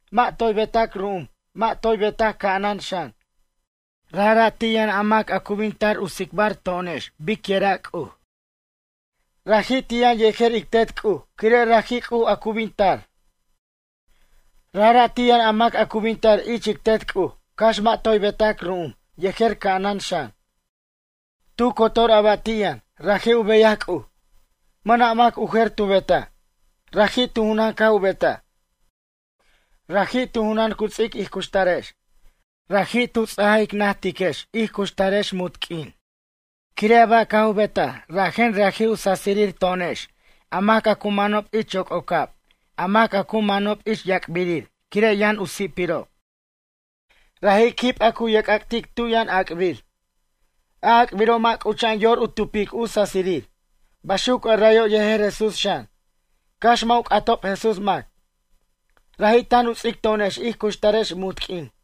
Mʌ' toy betac ru'um mʌ' toy betac ca'anan xan. Rajra' ti' yʌn a mac a cu bin tar u tsicbar to'onex bicyʌra' C'uj. Raji' ti' yʌn yejer ic Tet C'uj quire' raji' C'uj a cu bin tar. Rajra' ti' yʌn a mac a cu bin tar ich ic Tet C'uj cax mʌ' toy betac ru'um yejer ca'anan xan. Tu cotor a ba' ti' yʌn, raji' u beyaj C'uj. Mʌna' mac u jer tu betaj. Raji' tu junan caj u betaj. Raji' tu junan cu ts'ic ij cuxtarex. Raji' tu ts'aj ic najtiquex ij cuxtarex munt q'uin. Quire' a ba' caj u betaj rajen raji' u sasirir to'onex a mac a cu manob ich yoc'ocab a mac a cu manob ich yac'birir quire' yʌn u si'pirob. Raji' quib a cu ye'c'ac'tic tu yʌn ac'bir. A ac'biro' mʌ' c'ucha'an yor u tupic u sasirir. Baxuc arayo' yejer Jesús xan, cax mʌ' u c'atob Jesús mac. Raji' tan u ts'ic to'onex ij cuxtarex munt q'uin.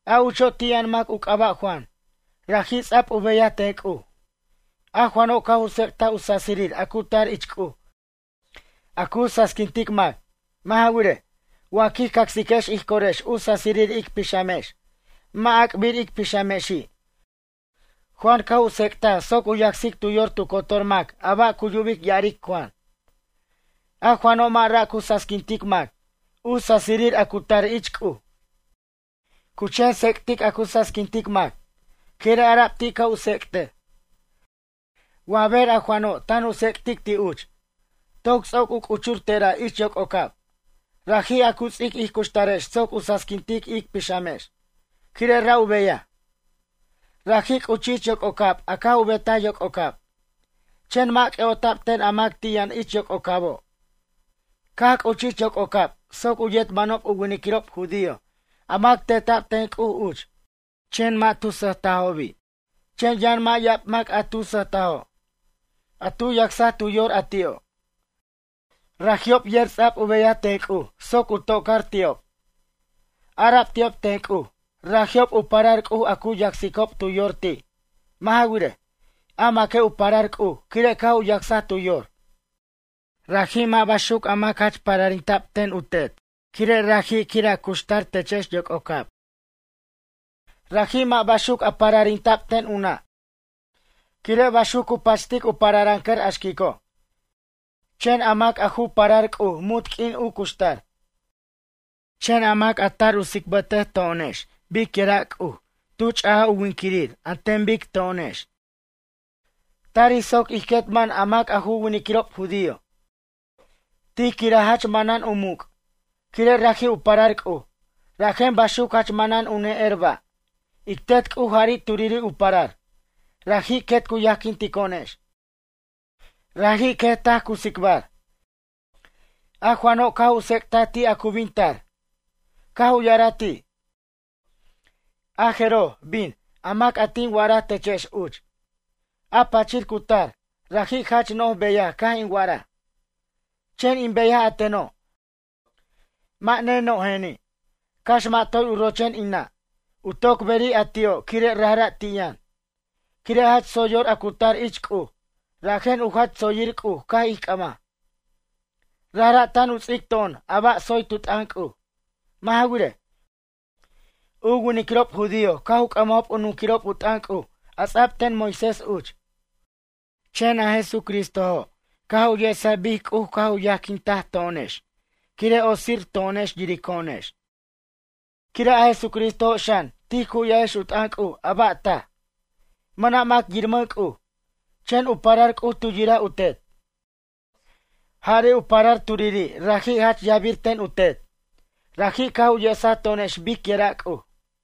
A ucho' ti' yʌn mac u c'aba' Juan. Raji' ts'a'b u beyaj ten C'uj. A Juano' caj u tsec'taj u sasirir a cu tar ich C'uj a cu sasiquintic mac. Mʌ' ja wirej, wa quij cacsiquex ij corex u sasirir ic pixamex, mʌ' ac'bir ic pixamexi'. Juan caj u tsec'taj soc u yacsic tu yor tu cotor mac a ba' cu yubic ya'aric Juan. A Juano' mʌ' ra' cu sasiquintic mac, u sasirir a cu tar ich C'uj, cu chen tsec'tic a cu sasiquintic mac. Quire' ara'b ti' ca' u tsec'tej. Wa ber a Juano' tan u tsec'tic ti' uch. Toc ts'oc u c'uchur tera' ich yoc'ocab, raji' a cu ts'ic ij cuxtarex soc u sasiquintic ic pixamex. Quire' ra' u beyaj. Raji' c'uchij ich yoc'ocab a caj u betaj yoc'ocab. Chen mʌ' c'ʌ'ota'b ten a mac ti' yʌn ich yoc'ocabo'. Caj c'uchij ich yoc'ocab soc u yet manob u winiquirob judío a mac teta'b ten C'uj uch. Chen mʌ' tu sʌjtajobi'. Chen yʌn mʌ' ya'ab mac a tu sʌjtajo', a tu yacsaj tu yor a ti'o'. Raji'ob yer ts'a'b u beyaj ten C'uj soc u to'car ti'ob. Ara'b ti'ob ten C'uj, raji'ob u parar C'uj a cu yacsicob tu yor ti'. Mʌ' ja wirej, a maque' u parar C'uj quire' caj u yacsaj tu yor. Raji' mʌ' baxuc a mac jach pararinta'b ten u tet quire' raji' quir a cuxtar techex yoc'ocab. Raji' mʌ' baxuc u pararinta'b ten u nʌ' quire' baxuc cu pachtic u pararʌncʌr a xquico'. Chen a mac a ju parar C'uj munt q'uin u cuxtar. Chen a mac a tar tsicbʌta to'onex bicyʌra' C'uj tu ch'aj u winquirir an ten bic to'onex. Tarij soc ij quet man a mac a ju winiquirob judío. Tij quiraj jach manan u muc'. Quire' raji' u parar C'uj, rajen baxuc jach manan u ne'er ba'. Ic Tet C'uj jari' turiri' u parar. Raji' quet cu yajquinto'onex. Raji' quet taj cu tsicbar. A Juano' caj u tsec'taj ti' a cu bin tar. Caj u ya'araj ti': ―A jeroj, bin, a mac a tin wa'araj techex uch. A pachir cu tar, raji' jach no'j beyaj caj in wa'araj. Chen in beyaj a teno', mʌ' neno'jeni'. Cax mʌ' toy u rochen in nʌ', u toc beri' a ti'o' quire' rajra' ti' yʌn. Quire' jach tsoy yor a cu tar ich C'uj, rajen u jach tsoyirir C'uj caj ij c'ʌmaj. Rajra' tan u ts'ic to'on a ba' tsoy tu t'ʌn C'uj. Mʌ' ja wirej, u winiquirob judío caj u c'ʌmajob u nunquirob u t'ʌn C'uj a ts'ab ten Moisés uch. Chen a Jesucristojo' caj u yesaj bic C'uj caj u yajquintaj to'onex quire' otsir to'onex yirico'onex. Quire' a Jesucristojo' xan tij cu'yajex u t'ʌn C'uj a ba' taj. Mʌna' mac yirmʌn C'uj. Chen u parar C'uj tu yiraj u Tet. Jari' u parar turiri' raji' jach yajbir ten u Tet. Raji' caj u yesaj to'onex bicyira' C'uj.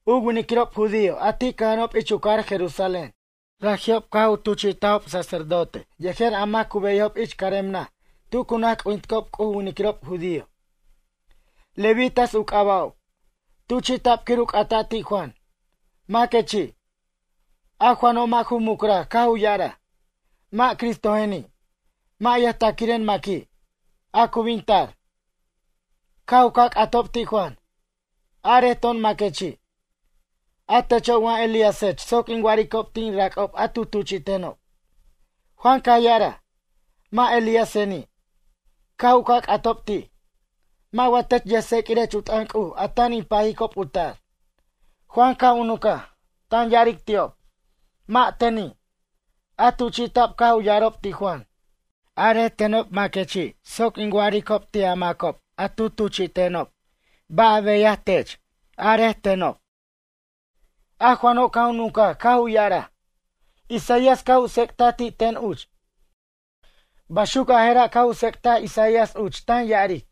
U winiquirob judío a ti' cʌja'anob ich u cajar Jerusalén. Raji'ob caj u tuchi'tajob sacerdote yejer a mac a cu beyajob ich carem naj tu cu naj c'ujinticob u winiquirob judío. Levitas u c'aba'ob. Tuchi'ta'b quir u c'ata' ti' Juan: ―Maquechi'? A Juano' mʌ' ju mucraj caj u ya'araj: ―Mʌ' Cristojeni', mʌ' yʌjtaquiren maqui', a cu bin tar. Caj u ca' c'atob ti' Juan: ―Arej to'on maquechi'? A techo' wa Elíasech soc in wa'aricob ti' in rac'ob a tu tuchi'tenob? Juan caj ya'araj: ―Mʌ' Elíaseni'. Caj u ca' c'atob ti': ―Mʌ' wa tech yʌjtseq'uirech u t'ʌn C'uj a tan in pajicob u tar? Juan caj u nuncaj, tan ya'aric ti'ob: ―Mʌ' teni'. A tuchi'ta'b caj u ya'arob ti' Juan: ―Arej tenob maquechi' soc in wa'aricob ti' a macob a tu tuchi'tenob ba' a beyaj tech, arej tenob. A Juano' caj u nuncaj caj u ya'araj: ―Isaías caj u tsec'taj ti' ten uch. Baxuc a jera' caj u tsec'taj Isaías uch tan ya'aric: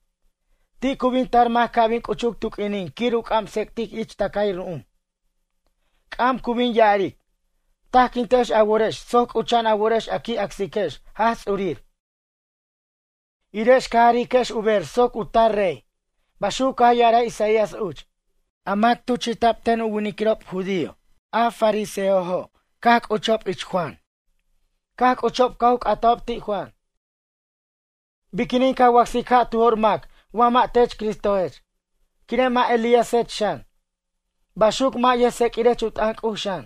“Ti' cu bin tar mac ca' bin c'uchuc tu q'uinin quir u c'am tsec'tic ich tʌcay ru'um.” C'am cu bin ya'aric: “Tajquintex a worex soc c'ucha'an a worex a qui' acsiquex Jaj Ts'urir irex ca jariquex u ber soc u tar rey.” Baxuc caj ya'araj Isaías uch. A mac tuchi'ta'b ten u winiquirob judío a fariseojo' caj c'uchob ich Juan. Caj c'uchob caj u c'atajob ti' Juan: ―Biquinin ca wacsic ja' tu jo'r mac wa mʌ' tech Cristojech? Quire' mʌ' Elíasech xan, baxuc mʌ' yʌjtseq'uirech u t'ʌn C'uj xan?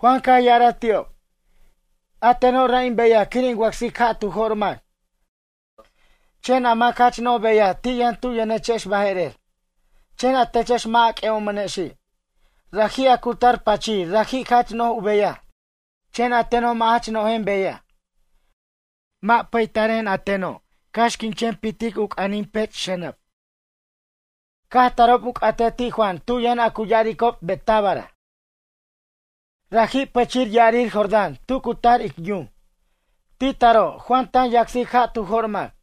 Juan caj ya'araj ti'ob: ―A teno' ra' in beyaj quir in wacsic ja' tu jo'r mac. Chen a mac jach no'j beyaj ti' yʌn tu yʌnechex baje'rer. Chen a techex mʌ' a c'ʌ'omʌnexi'. Raji' a cu tar pachir raji' jach no'j u beyaj chen a teno' mʌ' jach no'jen beyaj. Mʌ' pataren a teno' cax in chen pitic u c'anin pech' u xʌnʌb. Caj tarob u c'atej ti' Juan tu yʌn cu ya'aricob Betábara, raji' pichir ya'arir Jordán tu cu tar ic yum. Ti taro' Juan tan yacsic ja' tu jo'r mac.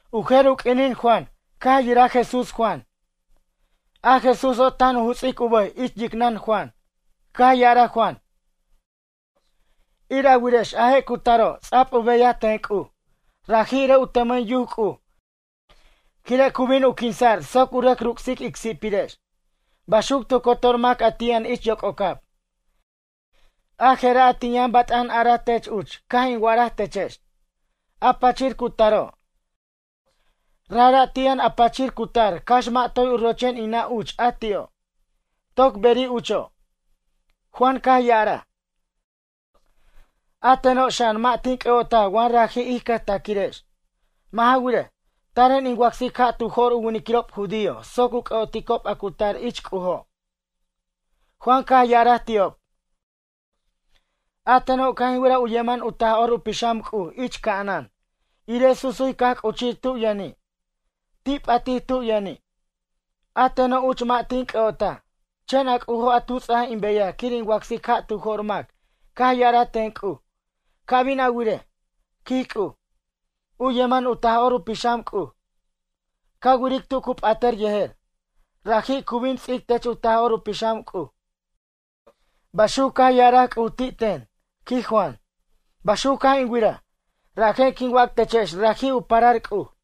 U jer u q'uinin Juan caj yiraj Jesús Juan. A Jesúso' tan u juts'ic u bʌj ich yicnʌn Juan. Caj ya'araj Juan: ―Ir a wirex a je' cu taro' ts'a'b u beyaj ten C'uj. Raji' irej u tʌmʌn yuc C'uj quire' cu bin u quinsa'r soc u rʌc ruc'sic ic si'pirex. Baxuc tu cotor mac a ti' yʌn ich yoc'ocab. A jera' a tin yʌn bat'an araj tech uch caj in wa'araj techex: “A pachir cu taro', rajra' ti' yʌn a pachir cu tar cax mʌ' toy u rochen in nʌ' uch a ti'o'. Toc beri' ucho'.” Juan caj ya'araj: ―A teno' xan mʌ' tin c'ʌ'otaj wa raji' ij cʌjtaquirex. Mʌ' ja wirej, taren in wacsic ja' tu jo'r u winiquirob judío soc u c'ʌ'oticob a cu tar ich C'ujo'. Juan caj ya'araj ti'ob: ―A teno' caj in wiraj u yeman u Taj'or u Pixam C'uj ich ca'anan, irej susuy caj c'uchij tu yʌni'. Ti' p'atij tu yʌni'. A teno' uch mʌ' tin c'ʌ'otaj. Chen a C'ujo' a tu ts'aj in beyaj quir in wacsic ja' tu jo'r mac caj ya'araj ten C'uj: “Ca' bin a wirej, quij C'uj, u yeman u Taj'or u Pixam C'uj. Ca wiric tu cu p'atʌr yejer. Raji' cu bin u ts'ic tech u Taj'or u Pixam C'uj.” Baxuc caj ya'araj C'uj ti' ten ―quij Juan―. Baxuc caj in wiraj, rajen quin wac techex raji' u parar C'uj.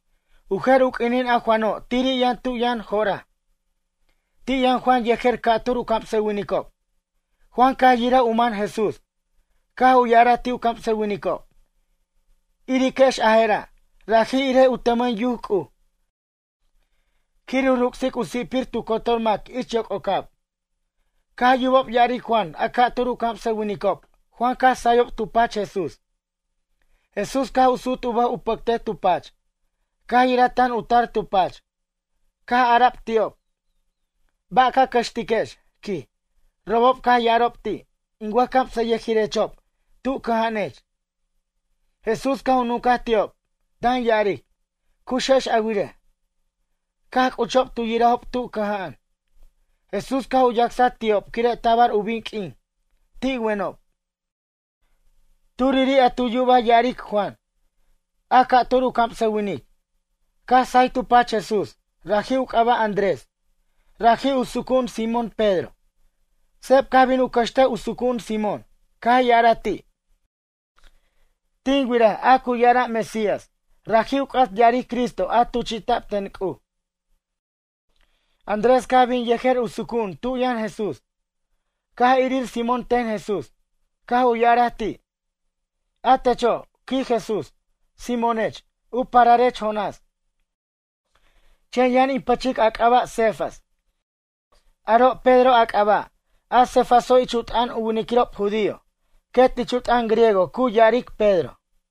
U jer u q'uinin a Juano' tiri' yʌn tu yʌn jo'raj. Ti' yʌn Juan yejer ca'tur u camsʌwinicob. Juan caj yiraj u man Jesús, caj u ya'araj ti' u camsʌwinicob: ―Iriquex a jera', raji' irej u tʌmʌn yuc C'uj, quir u ruc'sic u si'pir tu cotor mac ich yoc'ocab. Caj yubob ya'aric Juan a ca'tur u camsʌwinicob Juan caj sayob tu pach Jesús. Jesús caj u sut u bʌj u pʌctej tu pach. Caj yiraj tan u tar tu pach, caj ara'b ti'ob: ―Ba' ca cʌxtiquex? ―quij. Robob caj ya'arob ti': ―In wʌjcamsʌyʌjirechob, tu cʌja'anech? Jesús caj u nucaj ti'ob, tan ya'aric: ―Cuxex a wirej. Caj c'uchob tu yirajob tu cʌja'an. Jesús caj u yacsaj ti'ob quire' tabar u bin q'uin. Ti' wenob. Turiri' a tu yuba ya'aric Juan, a ca'tur u camsʌwinic, caj say tu pach Jesús, raji' u c'aba' Andrés. Raji' u sucu'un Simón Pedro. Seb caj bin u cʌxtej u sucu'un Simón. Caj ya'araj ti': ―Tin wiraj a cu ya'ara' Mesías ―raji' u c'at ya'aric Cristo a tuchi'ta'b ten C'uj. Andrés caj bin yejer u sucu'un tub yʌn Jesús. Caj irir Simón ten Jesús, caj u ya'araj ti': ―A techo' ―quij Jesús―, Simónech, u pararech Jonás. Chen yʌn in pʌchic a c'aba' Cefas, aro' Pedro a c'aba' ―a Cefaso' ich u t'ʌn u winiquirob judío, quet ich u t'ʌn griego cu ya'aric Pedro.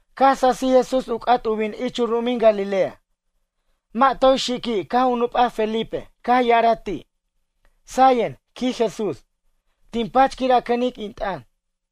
Caj sasij Jesús u c'at u bin ich u ru'umin Galilea. Mʌ' toy xiqui' caj u nup'a Felipe caj ya'ara ti': ―Sayen ―quij Jesús―, tin pach quir a cʌnic in t'ʌn.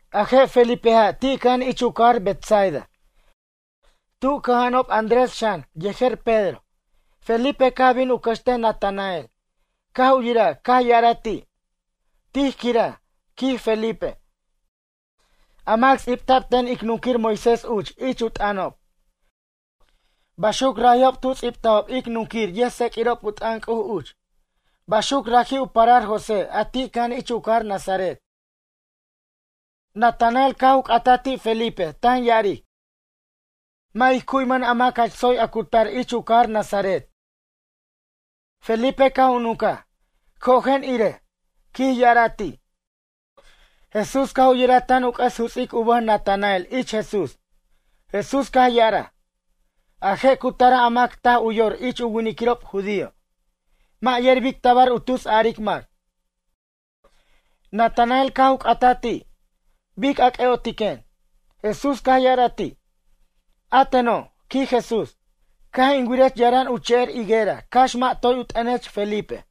A je' Felipeja' ti' cʌja'an ich u cajar Betsaida. Tu cʌja'anob Andrés xan yejer Pedro. Felipe caj bin u cʌxtej Natanael, caj u yiraj caj ya'araj ti': ―Tij quiraj ―quij Felipe―, a mac ts'ibta'b ten ic nunquir Moisés uch ich u t'ʌnob. Baxuc raji'ob tu ts'ibtajob ic nunquir yʌjtseq'uirob u t'ʌn C'uj uch. Baxuc raji' u parar José a ti' cʌja'an ich u cajar Nazaret. Natanael caj c'ataj ti' Felipe tan ya'aric: ―Mʌ' ij cu'wimʌn a mac jach tsoy a cu tar ich u cajar Nazaret. Felipe caj u nuncaj: ―Cojen irej ―quij ya'araj ti'. Jesús caj u yiraj tan u c'ʌs juts'ic u bʌj Natanael ich Jesús. Jesús caj ya'araj: ―A je' cu tara' a mac taj u yor ich u winiquirob judío. Mʌ' yer bic tabar u tus aric mac. Natanael caj u c'ataj ti': ―Bic a c'ʌ'otiquen? Jesús caj ya'araj ti': ―A teno' ―quij Jesús―, caj in wirech yaran u che'er higuera cax mʌ' toy u t'ʌnech Felipe.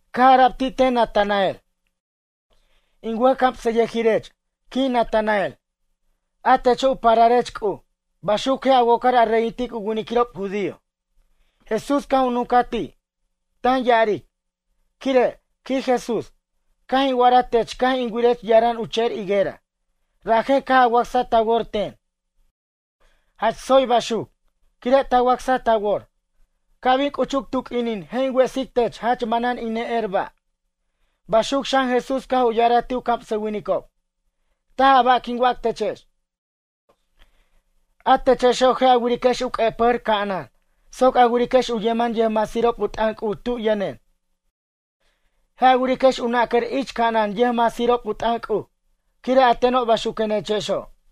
Caj ara'b ti' ten Natanael: ―In wʌjcamsʌyʌjirech ―quij Natanael―, a techo' u pararech C'uj. Baxuc je' a wocar a reyintic u winiquirob judío. Jesús caj u nuncaj ti', tan ya'aric: ―Quire' ―quij Jesús―, caj in wa'araj tech caj in wirech yaran u che'er higuera, rajen caj a wacsa ta wor ten? Jach tsoy baxuc, quire' ta wacsaj ta wor. Ca' bin c'uchuc tu q'uinin je' in wesic tech jach manan in ne'er ba'. Baxuc xan Jesús caj u ya'araj ti' u camsʌwinicob. ―Taj a ba' quin wac techex. A techexo' je' a wiriquex u q'ue'pʌjʌr ca'anan soc a wiriquex u yeman yʌjmasirob u t'ʌn C'uj tu yʌnen. Je' a wiriquex u nacar ich ca'anan yʌjmasirob u t'ʌn C'uj. Quire' a teno' baxuquenechexo'.